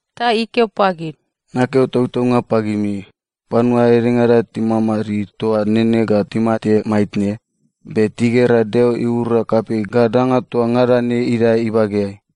Ta ikeo pagid, “Nakeo tautaunga pagimi, panua edengada timadmadid toa nene ga timate maitne, be tigera Deo iura kapei ga danga toa ngada ne idae ibageai.”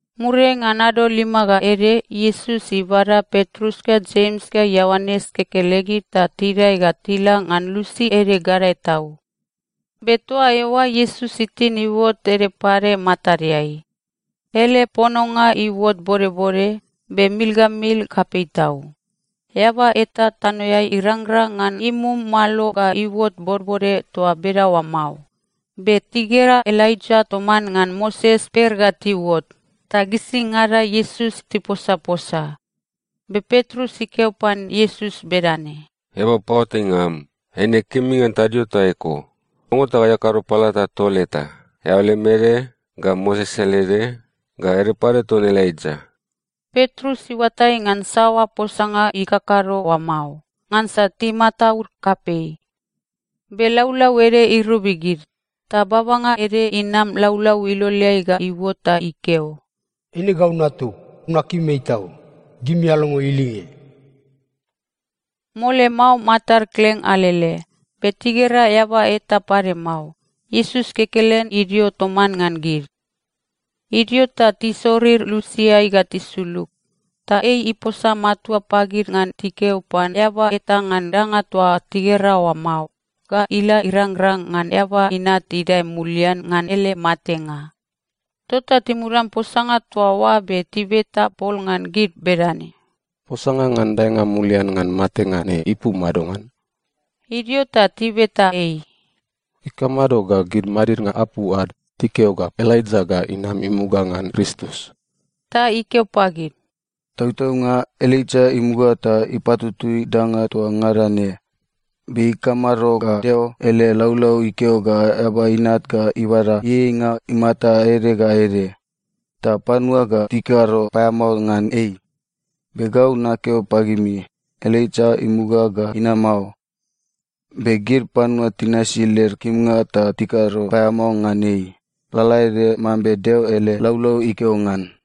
Muriai ngan ado lima ga ede, Iesus ibada Petrus ga Jems ga Ioanes kekelegid ta tidae ga tila ngan lusi ede gadae tau. Be toa eoa Iesus itin iuot ede pade matadeai. Ele pononga iuot bodbode, be mil ga mil kapei tau. Eaba eta tanoeai irangrang ngan imum malo ga iuot bodbode toa bedaoa mao. Be tigera Elaija toman ngan Moses per ga tiuot, ta gisingada Iesus tiposaposa. Be Petrus ikeo pan Iesus bedane, “Eaba paoatainga am, eine kemi ngan tadio toa eko. Longo ta gai akado palata tol eta, eao lem ede, ga Moses ele ede, ga ede pade ton Elaija.” (Petrus iuatai ngan saoa posanga ikakado oa mao, ngansa timataud kapei.) Be laulau ede irobi gid. Ta babanga ede inam laulau iloleai ga iuot ta ikeo, “Eine gau Natug. Nakim ei tau. Gimi alongo ilinge.” Mole mao, matad kleng alele, be tigera eaba eta pade mao. Iesus kekelen idio toman ngan gid. Idio ta tisorir lusiai ga tisulug, ta ei iposa matua pagid ngan tikeo pan eaba eta ngan danga toa tigera oa mao ga ila irangrang ngan Eaba Inat idae mulian ngan ele matenga. Tota timudan posanga toa oa be tibeta pol ngan gid bedane, “Posanga ngan daenga mulian ngan matenga ne ipu madongan?” Idio ta tibeta ei, “Ikamado ga gid madidnga apu ad tikeo ga Elaija ga inam imuga ngan Kristus?” Ta ikeo pagid, “Tautaunga, Elaija imuga ta ipatutui danga toa ngada ne. Be ikamado ga Deo ele laulau ikeo ga Eaba Inat ga ibada ieieinga imata ede ga ede, ta panua ga tikado paeamao ngan ei? Be gau nakeo pagimi, Elaija imuga ga inama o. Be gid panua tinasi led kimnga ta tikado paeamao ngan ei, lalaede mambe Deo ele laulau ikeo ngan.”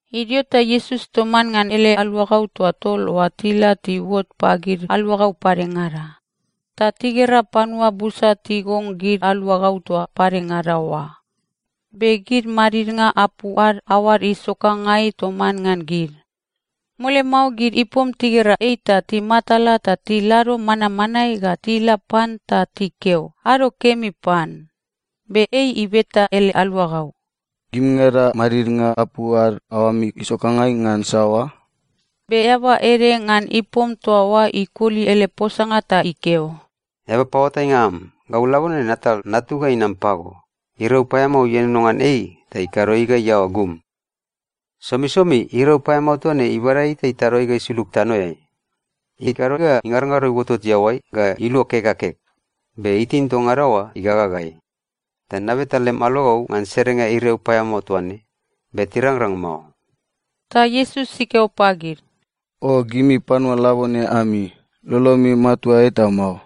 Idio ta Iesus toman ngan ele aluagau toa tol oa tila tiuot pagid aluagau padengada. Ta tigera panua busa tigong gid aluagau toa padengada oa. Be gid madidnga apu ad aoad isokangai toman ngan gid. Mole mao gid ipom tigera ei ta timatala ta tilado manmanae ga tila pan ta tikeo “ado kemi” pan. Be ei ibeta ele aluagau, “Gimingada madidnga apu ad aoami isokangai ngan saoa?” Be eaba ede ngan ipom toa oa ikoli ele posanga ta ikeo, “Eaba paoatainga am, gau labone natal natug ga inam pago. Iriau paeamao ienono ngan ei ta ikado ei ga iaoa gum. Somisomi iriau paeamao toa ne ibada ei ta itado ei ga isulug tanoeai. Ikado ga ingarongaro iuotot iaoai, ga iluo kek ga kek, be itin toa ngada oa igagagai. Ta nabeta lem aluagau ngan serenga iriau paeamao toa ne, be tirangrang mao.” Ta Iesus ikeo pagid, “O gimi panua labone ami! Lolomi matua eta mao.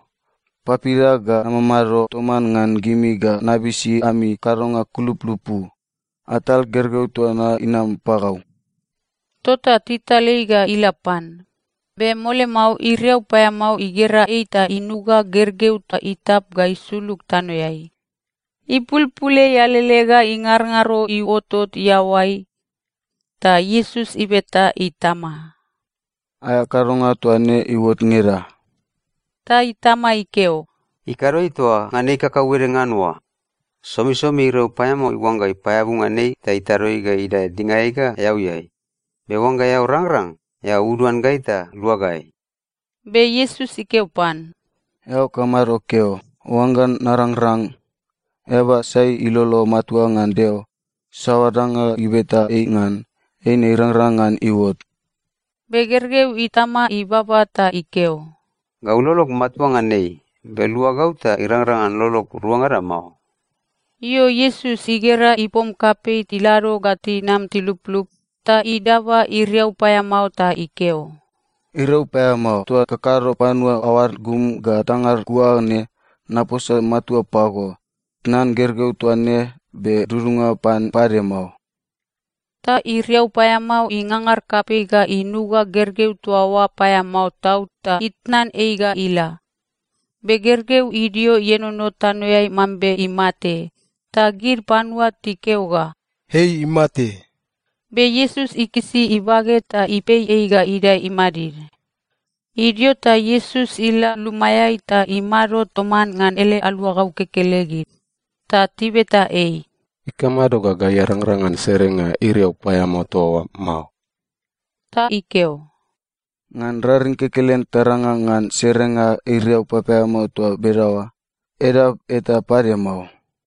Papida ga namamado toman ngan gimi ga nabisi ami kadonga kulupulupu? Atal gergeu toa na inam pagau.” Tota tital ei ga ila pan. Be mole mao iriau paeamao igera ei ta inuga gergeu ta itap ga isulug tanoeai. Ipulpul ei alele ga ingarongaro iuotot iaoai. Ta Iesus ibeta itama, “Aea kadonga toa ne iuot ngeda?” Ta itama ikeo, “Ikado ei toa ngan ei kakauede ngan oa. Somisomi iriau paeamao iuangga ipaeabu ngan ei ta itado ei ga idae dingaeai ga eauiai. Be oangga eao rangrang, eao uduan gai ta lua gai.” Be Iesus ikeo pan, “Eao kamado keo, ‘Oangga narangrang’? Eaba sai ilolo matua ngan Deo, saoa danga ibeta ei ngan, eine irangrang ngan iuot.” Be gergeu itama ibaba ta ikeo, “Gau lolog matua ngan ei, be lua gau ta irangrang ngan lolog ruangada mao!” Io, Iesus igera ipom kapei tilado ga tinam tiluplup, ta idaba iriau paeamao ta ikeo, “Iriau paeamao, toa kakado panua aoad gum ga tangad kua ne, naposa matua pago, tnan gergeu toa ne, be dudunga pan pade mao.” Ta iriau paeamao ingangar kapei ga inuga gergeu toa oa paeamao tau ta itnan ei ga ila. Be gergeu idio ienono tanoeai mambe imate, ta gid panua tikeo ga, “Ei imate!” Be Iesus ikisi ibage ta ipei ei ga idae imadid. Idio ta Iesus ila lumaeai ta imado toman ngan ele aluagau kekelegid. Ta tibeta ei, “Ikamado ga gai arangrang ngan serenga iriau paeamao toa oa mao?” Ta ikeo, “Ngan raring kekelen tarangrang ngan serenga iriau papaeamao toa bedaoa. Edap eta pade mao.”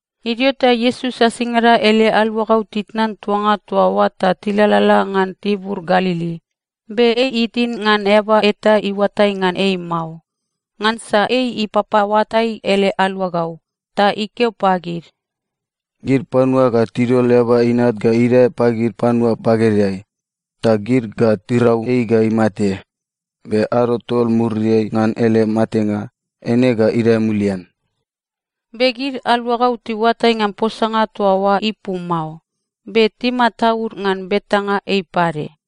Idio ta Iesus asingada ele aluagau titnan tuanga toa oa ta tilalala ngan tibur Galili. Be ei itin ngan eaba eta iuatai ngan ei mao, ngansa ei ipapaoatai ele aluagau. Ta ikeo pagid, “Gid panua ga tidol Eaba Inat ga idae pagid panua bagedeai. Ta gid ga tirau ei ga imate. Be ado tol muriai ngan ele matenga, eine ga idae mulian.” Be gid aluagau tiuatai ngan posanga toa oa ipu mao. Be timataud ngan betanga ei pade.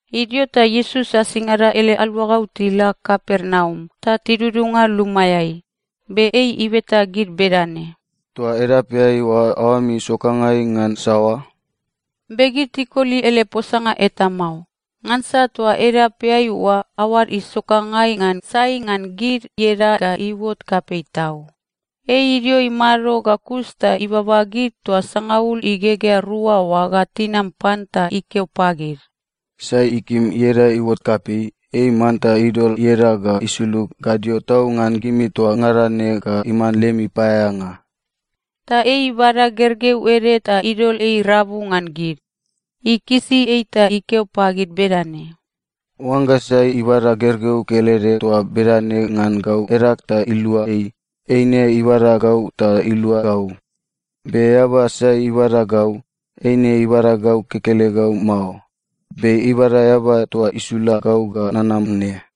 Idio ta Iesus asingada ele aluagau tila Kapernaum ta tidudunga lumaeai. Be ei ibeta gid bedane, “Toa edapeai oa aoami isokangai ngan saoa?” Be gid tikoli ele posanga eta mao, ngansa toa edapeai oa aoad isokangai ngan sai ngan gid ieda ga iuot kapei tau. Ei idio imado ga kus ta ibaba gid toa sangaul igegea rua oa ga tinam pan ta ikeo pagid, “Sai ikim ieda iuot kapei, ei manta idol ieda ga isulug gadio tau ngan gimi toa ngada ne ga iman lemi paeaeanga.” Ta ei ibada gergeu ede ta idol ei rabu ngan gid. Ikisi ei ta ikeo pagid bedane, “Oangga sai ibada gergeu kelede toa bedane ngan gau edag ta ilua ei, eine ibada gau ta ilua gau. Be eaba sai ibada gau, eine ibada gau kekelegau mao, be ibada Eaba toa isula gau ga nanam ne.”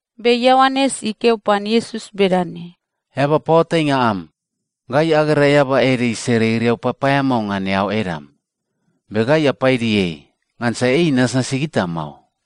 Be Ioanes ikeo pan Iesus bedane, “Eaba paoatainga am, gai agera eaba ede isere iriau papaeamao ngan eao edam. Be gai apaidi ei, ngansa ei inasnasi gita mao.”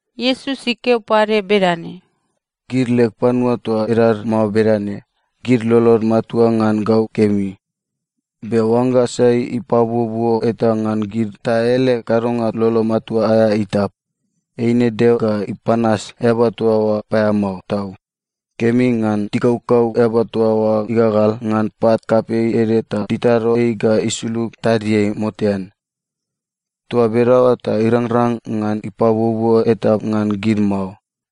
Iesus ikeo pade bedane, “Gid leg panua toa edad mao bedane, gid lolod matua ngan gau kemi. Be oangga sai ipabuobuo eta ngan gid ta ele kadonga lolo matua aea itap, eine Deo ga ipanas eaba toa oa paeamao tau. Kemi ngan tikaukau eaba toa oa igagal ngan pat kapei ede ta titado ei ga isulug tadiai motean. Toa bedaoa ta irangrang ngan ipabuobuo eta ngan gid mao.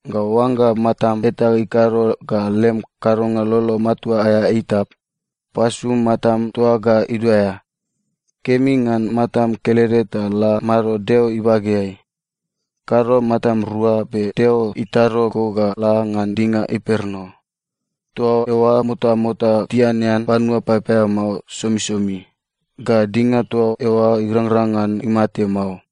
Ga oangga matam eta ikado ga lem kadonga lolo matua aea itap, pasu matam toa ga iduaea. Kemi ngan matam kelede ta la mado Deo ibageai. Kado matam rua, be Deo itado go ga la ngan dinga imperno. “‘Toa eoa motamota tianean panua papaeamao somisomi, ga dinga toa eoa irangrang ngan imate mao.’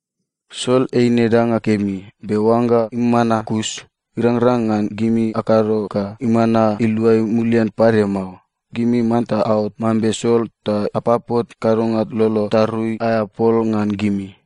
“Sol eine danga kemi. Be oangga imana kus, irangrang ngan gimi akado ga imana iluai mulian pade mao. Gimi manta aot mambe sol ta apapot kadonga lolo tarui aea pol ngan gimi.”